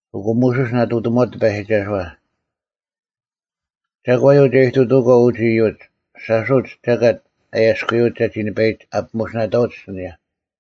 ᐊᑯ ᒧᓱᔅ ᓇᑐᑎᒧᐛᑦ ᑎᐸᔨᒋᒐᓱᐛ, “ᒐᒂᔪᐤ ᒐ ᐃᑐᑐᐅᒂᐤ ᐅᒡ ᐃᔪᒡ? ᓴᔅ ᐅᒡ ᒐᑲᑦ ᐊᔭᔅᑯᔪᐅᒡ ᒐᒋ ᓂᐸᐃᒡ ᐊᐱᒧᓯᓇᑕᐅᒡ ᐊᓯᓂᔭ᙮”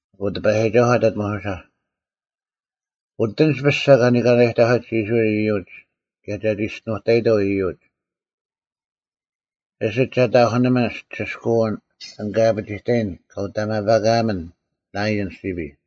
ᐊᑯ ᑎᐸᔨᒋᒐᓱᐤ ᐊᑕᑦ ᒧᓱᓴ, “ᐅᑎᓂᒡ ᐱᔅᒐ ᐅᒋᒪᐅᒡ ᐃᔅᕋᐃᓪ ᐃᔪᒡ ᑭᔭ ᒐ ᒋᔅᒋᓄᑕᐃᑥᐤ ᐃᔪᒡ, ᐊᓯᒡ ᒐ ᑕᐧᑯᓂᒥᓐ ᒋᓯᔅᑲᐅᓐ ᐊᓐ ᑲ ᐊᐱᒋᑕᔨᓐ ᑲ ᐅᑕᒪᐸᑲᒥᓐ ᓇᐃᔭᓪ ᓯᐱᔾ᙮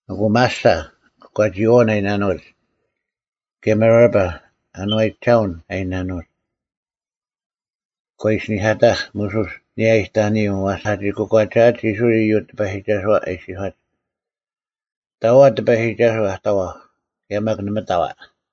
ᐊᑯ ᒪᓴ (ᑯᒂᒋᐃᐛᐅᓐ ᐊ ᐃᓇᓄᐅᒡ) ᑭᔭ ᒪᕆᐸ (ᐊᓏᔨᒐᓄᐅᓐ ᐊ ᐃᓇᓄᐅᒡ) ᒂ ᐃᓯᓂᐧᑲᑕᐧᒃ ᒧᓱᔅ ᐊᓂᔭ ᐃᑕᐅᓂᔪᐤ ᐛᔅ ᐊᒋ ᑯᒂᒐᐊᒡ ᐃᔅᕋᐃᓪ ᐃᔪᒡ ᑎᐸᔨᒋᒐᓱᐛ ᐊ ᐃᔅᒋᔄᒡ, “ᑕᐤ ᐊ ᑎᐸᔨᒋᒐᓱᐤ ᐊ ᑕᐛᐧᒄ ᑭᔭ ᒪᒃ ᓇᒪ ᑕᐤ ᐊ?”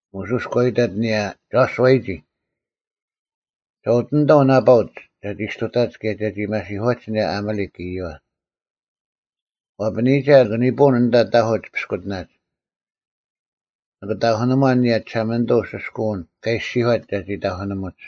ᒧᓱᔅ ᒂ ᐃᑕᑦ ᐊᓂᔭ ᒐᓱᐛᔨᒋ, “ᒐ ᐅᑎᓂᑥᐤ ᓇᐸᐅᒡ ᒐᒋ ᔅᑐᑕᒡ ᑭᔭ ᒐᒋ ᒪᓯᐧᑯᐛᒡ ᐊᓂᔭ ᐊᒪᓕᒃ ᐃᔪᐛ᙮ ᐛᐸᓂᔨᒐ ᓂᑭ ᓂᐳᐅᓐ ᐊᓐᑕ ᑕᐧᑯᒡ ᐱᔅᑯᑎᓇᒡ, ᓂᑭ ᑕᐧᑯᓇᒺᓐ ᐊᓂᔭ ᒋᓴᒪᓂᑐᐤ ᐅᓯᔅᑲᐅᓐ ᑲ ᐃᔅᒋᔄᑦ ᒐᒋ ᑕᐧᑯᓂᒧᒡ᙮”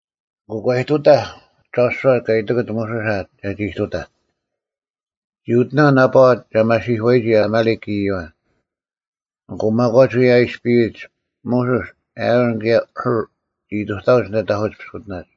ᐊᑯ ᒂ ᐃᑐᑕᐧᒃ ᒐᓱᐛ ᑲ ᐃᑎᑯᑦ ᒧᓱᓴ ᒐᒋ ᐃᑐᑕᐧᒃ᙮ ᒋ ᐅᑎᓇᐤ ᓇᐸᐛ ᒐ ᒪᓯᐧᑯᐛᔨᒋ ᐊᒪᓕᒃ ᐃᔪᐛ᙮ ᐊᑯ ᒪᒂᒡ ᐅᔭ ᐊᔅᐱᔨᒡ, ᒧᓱᔅ, ᐊᕋᓐ ᑭᔭ ᐦᐅᕐ ᒋ ᐃᑐᑕᐅᒡ ᐊᓐᑕ ᑕᐧᑯᒡ ᐱᔅᑯᑎᓇᒡ᙮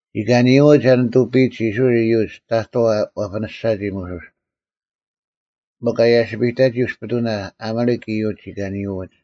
ᒋ ᑲᓂᔪᐎᒡ ᐊ ᓂᑐᐱᔨᒡ ᐃᔅᕋᐃᓪ ᐃᔪᒡ ᑕᑥᐤ ᐛᐱᓂᔅᒐᒋ ᒧᓱᔅ, ᒥᒄ ᐊ ᔭᓯᐱᑕᒋ ᐅᔅᐱᑐᓇ ᐊᒪᓕᒃ ᐃᔪᒡ ᒋ ᑲᓂᔪᐎᒡ᙮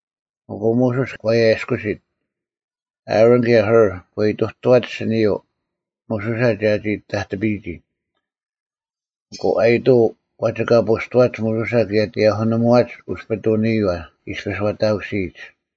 ᐊᑯ ᒧᓱᔅ ᒂ ᐊᔭᔅᑯᓯᑦ, ᐊᕋᓐ ᑭᔭ ᐦᐅᕐ ᒂ ᐃᑐᑐᐛᒡ ᐊᓯᓂᔪᐤ ᒧᓱᓴ ᒐᒋ ᑕᑎᐱᔨᒋ᙮ ᐊᑯ ᐊᔨᑐᐤ ᐛᒋᑲᐳᔅᑐᐛᒡ ᒧᓱᓴ ᑭᔭ ᑎᔭᐧᑯᓂᒧᐛᒡ ᐅᔅᐱᑐᓂᔨᐛ ᐃᔅᐱᔅ ᐛᑕᑯᓯᔨᒡ᙮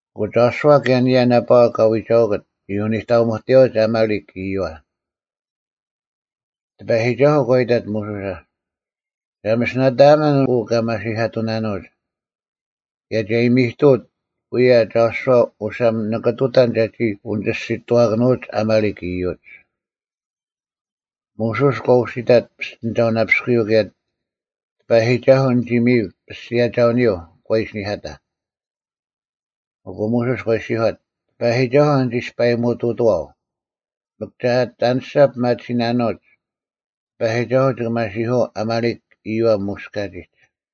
ᐊᑯ ᒐᓱᐛ ᑭᔭ ᐊᓂᔭ ᓇᐸᐛ ᑲ ᐎᒐᐅᑯᑦ ᒋ ᐅᓂᑕᒧᑎᔭᐅᒡ ᐊᒪᓕᒃ ᐃᔪᐛ᙮ ᑎᐸᔨᒋᒐᓱᐤ ᒂ ᐃᑕᑦ ᒧᓱᓴ, “ᒐ ᒥᓯᓇᑕᒥᓐ ᐅ ᑲᒪᓯᐧᑲᑐᓇᓄᐅᒡ, ᑭᔭ ᒐ ᐃᔨᒥᑐᐅᑦ ᐅᔭ ᒐᓱᐛ ᐅᓴᒻ ᓂᑭ ᑐᑕᓐ ᒐᒋ ᐅᓂᒋᔅᒋᑐᐛᑭᓄᐅᒡ ᐊᒪᓕᒃ ᐃᔪᒡ᙮” ᒧᓱᔅ ᒂ ᐅᓯᑕᑦ ᐱᔅᑎᓂᒐᐅᓇᐱᔅᑯᔪᐤ ᑭᔭ “ᑎᐸᔨᒋᒐᓱᐤ ᓂᒋ ᒥᔨᒄ ᐱᔅᒋᔭᒐᐅᓂᔪᐤ᙮” ᒂ ᐃᓯᓂᐧᑲᑕᐧᒃ᙮ ᐊᑯ ᒧᓱᔅ ᒂ ᐃᔅᒋᔄᑦ, “ᑎᐸᔨᒋᒐᓱᐤ ᓂᒋ ᐊᔅᐸᔨᒧᑐᑐᐛᐤ, ᒥᒄ ᒐ ᐊᑎ ᐊᓂᔅᒐ ᐱᒪᑎᓯᓇᓄᐅᒡ, ᑎᐸᔨᒋᒐᓱᐤ ᒋᑭ ᒪᓯᐧᑯᐛᐤ ᐊᒪᓕᒃ ᐃᔪᐛ ᒧᔅ ᑲᒋᒡ᙮”